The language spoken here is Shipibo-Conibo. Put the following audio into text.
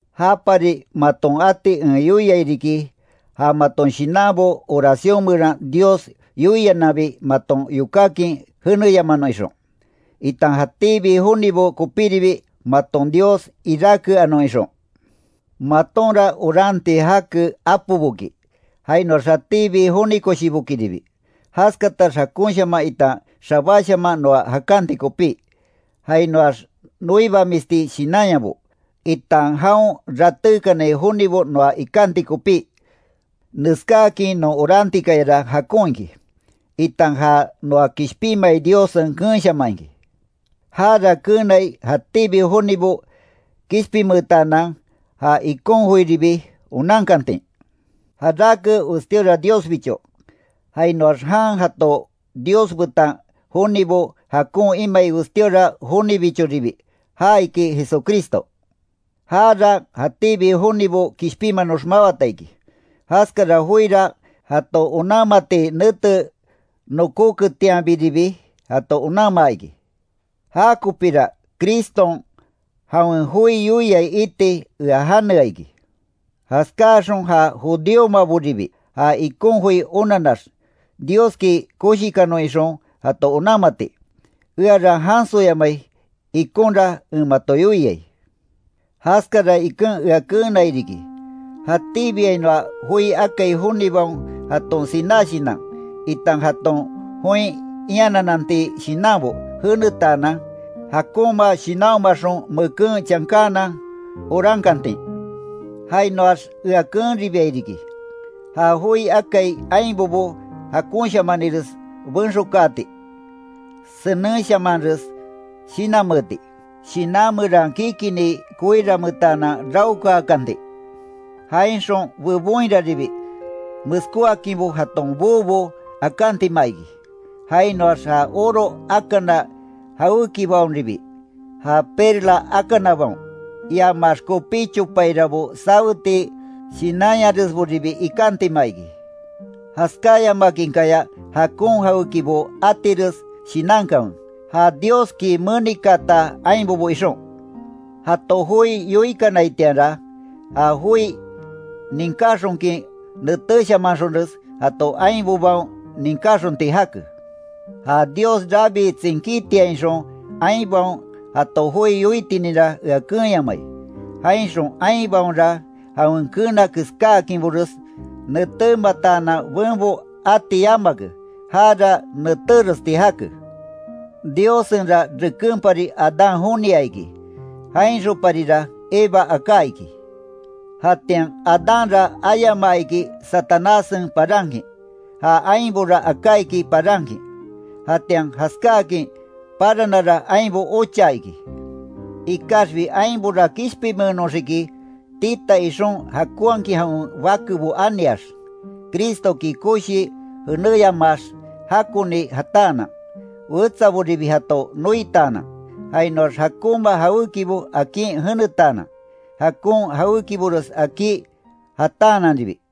Japari maton ati en yoiai riki, ja maton shinanabo oracion meran Dios yoiananbi maton yokákin jeneyamanon ixon, itan jatíbi jonibo kopíribi maton Dios iráke anon ixon. Matonra oranti jake apoboki, jainoax jatíbi joni koshibokiribi, jaskatax jakonshaman itan xabáshaman noa jakanti kopí, jainoax noibamisti shinanyabo, itan jaon ratékanai jonibo noa ikanti kopí. Neskáakin non orantikayara jakon iki, itan ja noa kishpinmai Diossen keenshaman iki. Jara keenai, jatíbi jonibo kishpinmeetaanan ja ikon joiribi onankantin. Jarake westíora Diosbicho, jainoax jan jato Dios betan jonibo jakon imai westíora jonibichoribi, ja iki Jesucristo. Jara jatíbi jonibo kishpinmanox mawata iki, jaskara joira jato onanmati nete nokóketianbiribi, jato onanmaa iki. Jakopira Criston jawen joi yoiai iti ea janea iki. Jaskáaxon ja judíomaboribi, ja ikon joi onanax, Dioski koshikanon ixon jato onanmati, eara jansoyamai ikonra en mato yoiai. Jaskara iken ea keenai riki, jatíbiainoa joi akai jonibaon jaton siná shinan, itan jaton join ianananti shinanbo jenetaanan, jakonma shinanhomaxon meken chankaanan orankantin. Jainoax ea keenribiai riki, ja joi akai ainbobo jakonshamanires benxokaati, senenshamanres shinanmeeti, shinan meran kikini koiranmeetanan raokaakanti, jainxon bebonhiraribi meskóakinbo jaton boobo akantima iki, jainoax ja oro akana jawékibaonribi, ja perla akanabaon, iamax kopí chopairabo saweti shinanyaresboribi ikantima iki. Jaskáyamakinkaya jakon jawékibo atires shinankanwe, ja Dioski menikaata ainbobo ixon. Jato joi yoikanaitianra, ja joi ninkáxonkin netéshamanxonres jato ainbobaon ninkáxonti jake. Ja Dios rabii tsinkítiainxon ainbaon jato joi yoitininra ea keenyamai, jainxon ainbaonra jawen keena keskáakinbores netémataanan benbo ati yamake, jara netéresti jake. Diossenra rekenpari Adán jonia iki, jainxonparira Eva aká iki. Jatian Adánra ayamaa iki Satanássen parankin, ja ainbora aká iki parankin, jatian jaskáakin paranara ainbo ochaa iki. Ikaxbi ainbora kishpinmenoxiki tita ixon jakonhakin jawen bakebo aniax, Cristoki koshii jenéyamaax jakoni jataanan, wetsaboribi jato noitaanan, jainoax jakonma jawékibo akin jenetaanan, jakon jawékibores akí jataananribi.